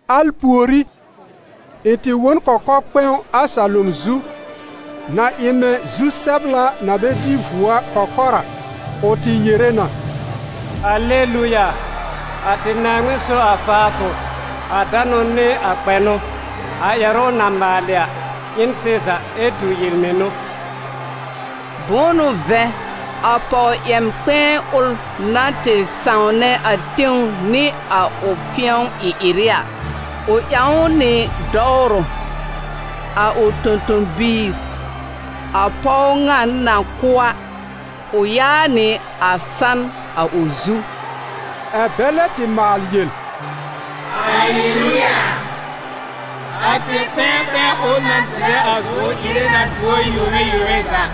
Al pùorí, ɩ̃ tɩ wõ n kɔkɔ-kpɛ̃w a salom zu, na ɩ mɛ̃ zu-sɛbla na bɛ dɩ vuo a kɔkɔr a, ʋ tɩ yere na: « Aleluya! A tɩ Naaŋmɩn so a faafʋ, a danʋ nɩ a kpɛnʋ. A ƴɛrʋ ʋ na maalɩ a ɩ n sɩza ɛ tu yel-mɩnʋ. Bʋ̃ʋ n'ʋ vɛ̃, a pɔw-yɛm-kpɛ̃ɛ ʋl na tɩ sãwnɛ a tẽw nɩ a ʋ pɩ̃ɔ-ɩ-ɩrɩ a, ʋ ƴãw ʋ nɩ dɔwrʋ. A ʋ tõ-tõ-biir, a pɔw ŋa na kʋ́ a, ʋ yaá nɩ a san a ʋ zu.» Ɛ̀ bɛ lɛ tɩ maal yel: « Aleluya! A tẽ-kpɛ̃ɛ kpɛ̃ɛ ʋl na dɩrɛ a zʋ̀ʋ́r ire na duor yome yome za!»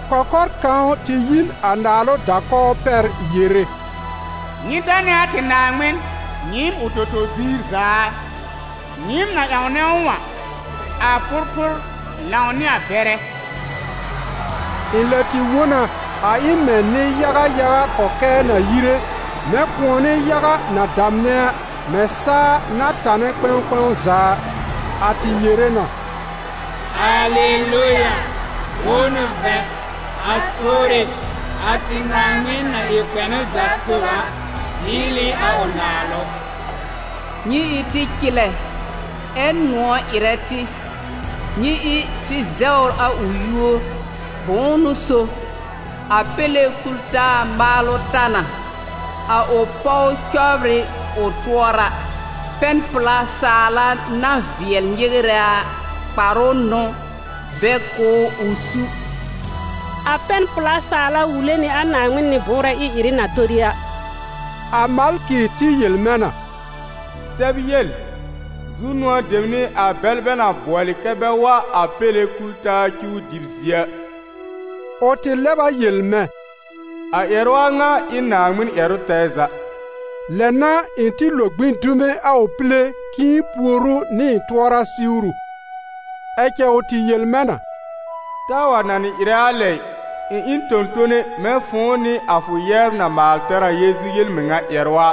Kɔkɔr kãw tɩ yi n a naalʋ da-kɔw pɛr yere: «Nyɩ danɛ a tɩ Naaŋmɩn, nyɩɩm ʋ tõ-tõ-biir za a, nyɩɩm na ƴãwnɛ ʋ a, a pʋrpʋr lãw nɩ a bɛrɛ!» Ɩ̃ lɛ tɩ wõ na, a ɩ mɛ̃ nɩ-yaga yaga kɔkɛɛ na yire, mɛ̃ kʋ̃ɔnɩ yaga na damnɛ a, mɛ̃ saa na tanɛ kpɛ̃w kpɛ̃w za a. A tɩ yere na: « Aleluya! Bʋ̃ʋ n'ʋ vɛ̃, a Sore, a tɩ Naaŋmɩn na ɩ kpɛnʋ za sob a, zɩɩl ɩ a ʋ naalʋ. Nyɩ ɩ tɩ cɩlɛ, ɛ́ nʋ̃ɔ̀ ɩrɛ tɩ, nyɩ ɩ tɩ zɛwr a ʋ yúor! Bʋ̃ʋ n'ʋ so, a Péle kul-taa maalʋ ta na, a ʋ pɔw cɔbr ɩ ʋ tʋɔra. Pɛn-pla saala na vɩɛl nyɩwrɛ a kparʋ n'ʋ bɛ kʋ̀ ʋ ʋ su.» A pɛn-pla saala wule nɩ a Naaŋmɩn nɩ-bʋʋrɛ ɩ-ɩrɩ na tori a. A malkɩ tɩ yel mɛ̃ na: «Sɛb yel: zu-nʋ̃ɔ dem n'ɩ a bɛl bɛ na bʋɔlɩ kɛ́ bɛ wa a Péle kul-taa cuw dɩb zie a.» Ʋ tɩ lɛb a yel mɛ̃: «A ƴɛrʋ a ŋa ɩ n Naaŋmɩn ƴɛrʋ tɛɛ za.» Lɛ n'a ɩ̃ tɩ lo gbĩ dume a ʋ pile k'ɩ̃ɩ pùor ʋ nɩ ɩ̃ tʋɔra siwru, ɛ cɛ ʋ tɩ yel mɛ̃ na: «Taa wa nanɩ ɩrɛ a lɛ ɩ! Ɩ̃ ɩ n tõ-tone mɛ̃ fʋ̃ʋ nɩ a fʋ yɛbr na maal tɛr a Yeezu yel-mɩŋa ƴɛrʋ a.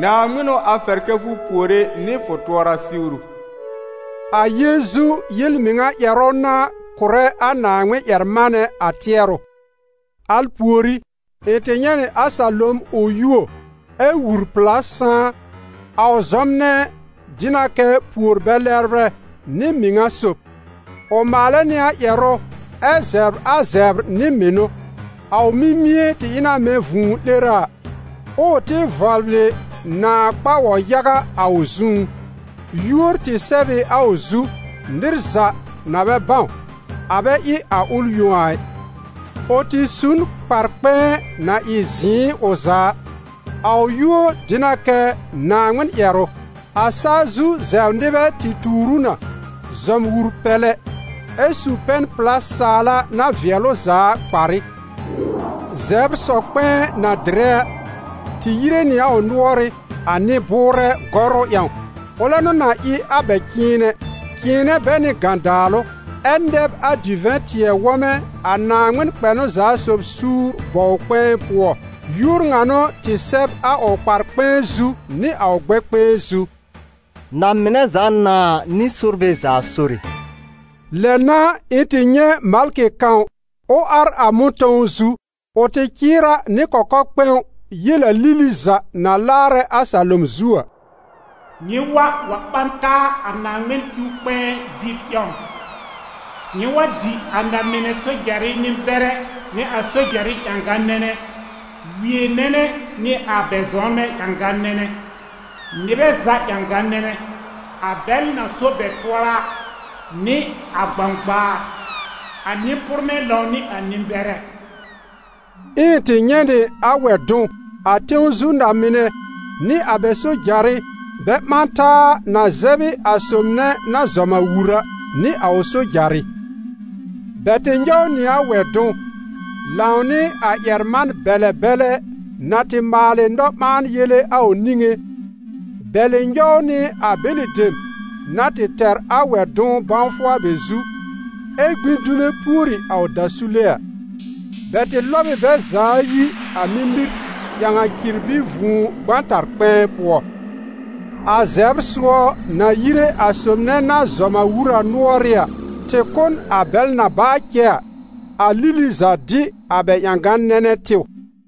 Naaŋmɩn n'ʋ a fɛr kɛ́ fʋ puore nɩ fʋ tʋɔra siwru.» A Yeezu yel-mɩŋa ƴɛrʋ n'a kʋ̀rɛ a Naaŋmɩn-ƴɛr-manɛ a tɩɛrʋ. Al pùorí, ɩ̃ tɩ nyɛ̃ nɩ a salom ʋ yuo, ɛ wur-pla sãá. A ʋ zɔmnɛ dɩ na kɛ Pùor-bɛ-lɛbrɛ nɩ Mɩŋa-sob; ʋ maalɛ nɩ a ƴɛrʋ ɛ zɛbr a zɛbr nɩ mɩnʋ. A ʋ mimie tɩ ɩ na mɛ̃ vũu-'lera a, ɛ ʋ tɩ vɔbl ɩ nãà kpa-wɔ-yaga a ʋ zũú. Yúor tɩ sɛb ɩ a ʋ zu, nɩr za na bɛ bãw, a bɛ ɩ a ʋl yõ a ɩ. Ʋ tɩ su n kpar-kpɛ̃ɛ na ɩ zɩ̃ɩ ʋ za a. A ʋ yúor dɩ na kɛ: «Naaŋmɩn-ƴɛrʋ.» A saa zu zɛbr nɩbɛ tɩ tuur ʋ na, zɔm wur-pɛlɛ ɛ su pɛn-pla saala na vɩɛl ʋ za a kparɩ. Zɛbr sɔ-kpɛ̃ɛ na dɩrɛ a, tɩ yire nɩ a ʋ nʋɔrɩ́, a nɩ-bʋʋrɛ gɔrʋ ƴãw. Ʋlɛ n'ʋ na ɩ a bɛ cɩ̃ɩnɛ, cɩ̃ɩnɛ bɛ nɩ gãdaalʋ, ɛ nɛb a divɛ̃-tɩɛ-wɔmɛ a Naaŋmɩn kpɛnʋ-za-sob suur bɔw-kpɛ̃ɛ pʋɔ. Yúor ŋa n'ʋ tɩ sɛb a ʋ kpar-kpɛ̃ɛ zu nɩ a ʋ gbɛkpɛ̃ɛ zu: «Na-mɩnɛ za Nãa nɩ sorbɛ za Sore.» Lɛ n'a ɩ̃ tɩ nyɛ̃ malkɩ kãw ʋ ar a mʋ̃tɔ̃w zu. Ʋ tɩ cɩɩr a nɩ kɔkɔ-kpɛ̃w yel a lili za na laarɛ a salom zu a: «Nyɩ wa, wa ɓã taa a Naaŋmɩn cuw-kpɛ̃ɛ dɩb ƴãw! Nyɩ wa dɩ na-mɩnɛ, sojarɩ nɩ-bɛrɛ nɩ sojarɩ ƴãgã-nɛnɛ, wie nɛnɛ nɩ a bɛ zɔmnbɛ ƴãgã-nɛnɛ, nɩbɛ za ƴãgã-nɛnɛ, a bɛl na so bɛ tʋɔra a nɩ a gbãgbaar, a nɩ-pʋrmɛ lãw nɩ a nɩ-bɛrɛ.» Ɛ ɩ̃ tɩ nyɛ̃ nɩ a wɛ-dʋ̃w, a tẽw zu na-mɩnɛ nɩ a bɛ sojarɩ bɛ ɓã taa na zɛb ɩ a sob nɛ na zɔm a wur a, nɩ a ʋ sojarɩ. Bɛ tɩ nyɔw nɩ a wɛ-dʋ̃w, lãw nɩ a ƴɛr-man-bɛlɛ bɛlɛ na tɩ maalɩ nɔ-ɓãa-yele a ʋ niŋé, bɛ̀lɩ nyɔw nɩ a bɛlɩ dem na tɩ tɛr a wɛ-dʋ̃w bãwfʋ a bɛ zu, ɛ gbĩ dume pùori a ʋ dasule a. Bɛ tɩ lɔb ɩ bɛ za ayi a mimir, ƴãw a cirbi vũu gbãtar-kpɛ̃ɛ pʋɔ. A zɛbr-sʋɔ, na yire a sob nɛ na zɔm a wur a nʋɔrɩ́ a, tɩ kʋ́ n a bɛl na baa cɛ a, a lili za dɩ a bɛ ƴãgã-nɛnɛ tɩw.